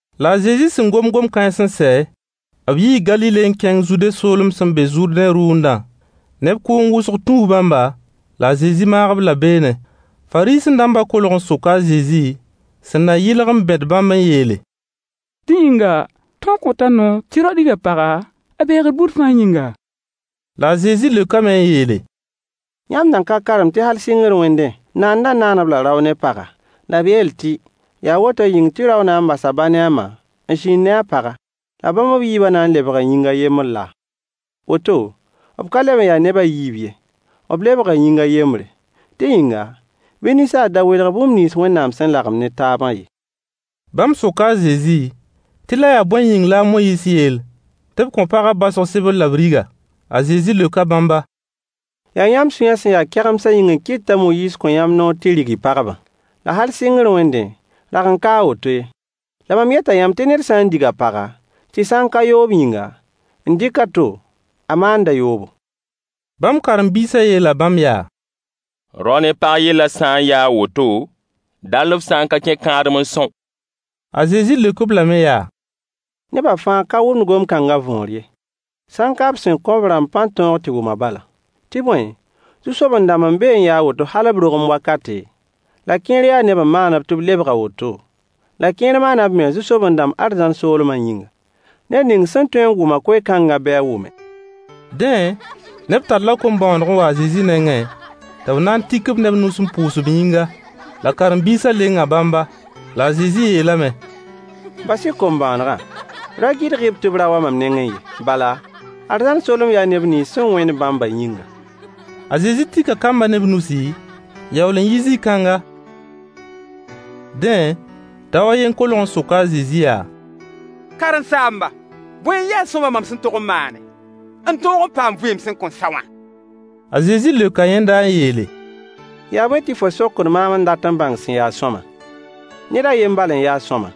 La a Zezi sẽn gom gom-kãens n sɛ, b yii Galile n kẽng Zude soolem sẽn be Zʋrdẽ rʋʋndã. Neb kʋʋng wʋsg tũu bãmba, la a Zezi maag-b-la beene. Fariisẽ-dãmbã kolg n soka a Zezi, sẽn na yɩlg n bẽd bãmb n yeele: Dẽ yĩnga, tõog kõta noor tɩ rao dig a paga a beegr buud fãa yĩnga? La a Zezi leokame n yeele: Yãmb nan ka karem tɩ hal sɩngr wẽndẽ, Naandã “naan-b-la rao ne paga,” la b yeel tɩ “yaa woto yĩng tɩ rao na n bas a ba ne a ma n zĩnd ne a paga, la bãmb b yiiba na n lebga yĩng a yembr laa?” Woto, b ka leb n ya neb a yiib ye, b lebga yĩng a yembre. Dẽ yĩnga, bɩ ninsaal da welg bũmb nins Wẽnnaam sẽn lagem ne taabã ye. Bãmb soka a Zezi tɩ la yaa bõe yĩng la a Moyiis yeel tɩ b kõ pagã baosg sebr la b rig-a? A Zezi leoka bãmba: Yaa yãmb sũyã sẽn ya kegemsã yĩng n kɩt t'a Moyiis kõ yãmb noor tɩ y rig y pagbã. La hal sɩngr wẽndẽ, rag n ka a woto ye. La mam yeta yãmb tɩ ned sã n dig a paga, tɩ sã n ka yoob yĩnga, n dɩk a to, a maanda yoobo. Bãmb karen-biisã yeela bãmb yaa: Rao ne pag yellã sã n ya a woto, dall f sã n ka kẽ kãadem n são. A Zezi leok-b lame yaa: Nebã fãa ka wʋmd gom-kãngã võor ye, sã n ka b sẽn kõ b rãmb pãn-tõog tɩ wʋmã bala. Tɩ bõe, zu-soben-dãmb n be n ya a woto hal b rogem wakate, la kẽer yaa neb n maan-b tɩ b lebg a woto, la kẽer maana b mens zu-soben-dãmb arzãn soolmã yĩnga. Ned ning sẽn tõe n wʋm-a koe-kãngã bɩ a wʋme. Dẽ, neb talla kom-bõoneg n wa a Zezi nengẽ tɩ b na tik-b ne b nus n pʋʋs b yĩnga. La karen-biisã lenga bãmba. La a Zezi yeelame: Bas-y kom-bõonegã, ra gɩdg-b tɩ b ra wa mam nengẽ ye. Bala, arzãn soolem yaa neb nins sẽn wẽnd bãmbã yĩnga. A Zezi tika kambã ne b nusi, n yaool n yi zĩ-kãnga. Dẽ, dao a yen kolg n soka a Zezi yaa: Karen-saamba, bõe n ya sõama mam sẽn tog n maane, n tõog n paam vɩɩm sẽn kõn sa wã? A Zezi leoka yẽnda n yeele: Yaa bõe tɩ fo sokd maam n dat n bãng sẽn ya sõama? Ned a yen bal n ya sõama.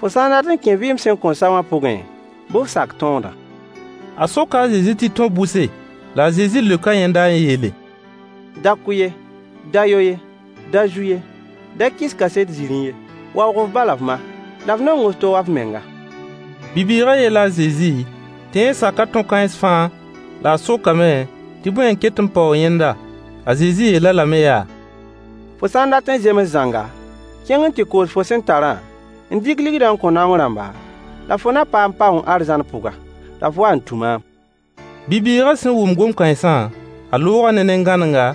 Fo sã n dat n kẽ vɩɩm sẽn kõn sa wã pʋgẽ, bɩ f sak tõodã. A soka a Zezi tɩ tõ-bʋse? La a Zezi leoka yẽnda n yeele: “Da kʋ ye, da yo ye, da zu ye, da kɩs kaset-zĩrĩ ye, waoog f ba la f ma, la f nong f to wa f menga.” Bi-bɩɩgã yeela a Zezi tɩ yẽ saka tõ-kãens fãa, la a sokame tɩ bõe n ket n paoog yẽnda? A Zezi yeel-a lame yaa: Fo sã n dat n zems zãnga, kẽng n tɩ koos fo sẽn tarã, n dɩk ligdã n kõ naong rãmba, la fo na paam paoong arzãn pʋga. La f wa n tũ maam. Bi-bɩɩgã sẽn wʋm gom-kãensã, a looga ne nen-gãnenga,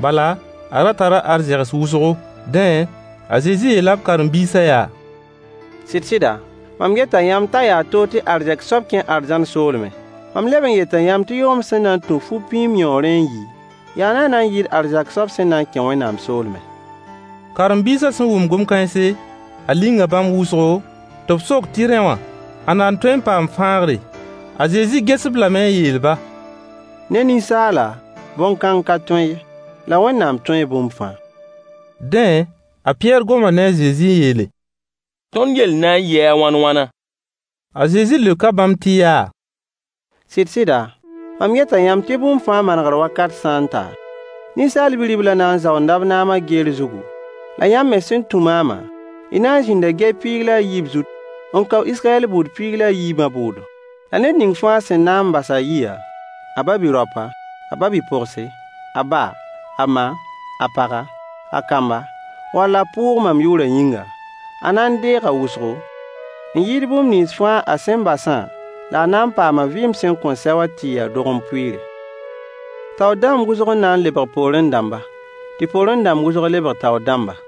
bala, a ra tara arzegs wʋsgo. Dẽ, a Zezi yeela b karen-biisã yaa: Sɩd-sɩda, mam yeta yãmb t'a yaa toog tɩ arzɛk soab kẽ arzãn soolmẽ. Mam leb n yeta yãmb tɩ yʋgemd sẽn na n tũ fu-pĩim yõorẽ n yi yaa naana n yɩɩd arzɛk soab sẽn na n kẽ Wẽnnaam soolmẽ. Karen-biisã sẽn wʋm gom kãense, a linga bãmb wʋsgo, tɩ b sok tɩ rẽ wã, ãnna n tõe n paam fãagre? A Zezi ges-b lame n yeel-ba: Ne ninsaala bõn-kãng ka tõe ye, la Wẽnnaam tõe bũmb fãa. Dẽ, a Pɩyɛɛr goma ne a Zezi n yeele: Tõnd yell na n yɩɩ a wãn-wãna? A Zezi leoka bãmb tɩ yaa: Sɩd-sɩda, mam yeta yãmb tɩ bũmb fãa manegr wakat sã n ta, Ninsaal Bi-riblã na n zaoonda b naamã geer zugu, la yãmb me sẽn tũ maamã, y na n zĩnda gɛy piig la a yiib zut n kao Israyɛl buud piig la a yiibã bʋʋdo. La ned ning fãa sẽn na n bas a yiya, a ba-bi-raopa, a ba-bi-pogse, a ba, a ma, a paga, a kamba wall a pʋʋg mam yʋʋrã yĩnga, a na n deega wʋsgo, n yɩɩd bũmb nins a sẽn basã la a na n paama vɩɩm sẽn kõn sɛ wã tɩ yɩ a dogem pʋɩɩre. Taoor dãmb wʋsg n na n lebg poorẽ dãmba, tɩ poorẽ dãmb wʋsg lebg taoor dãmba.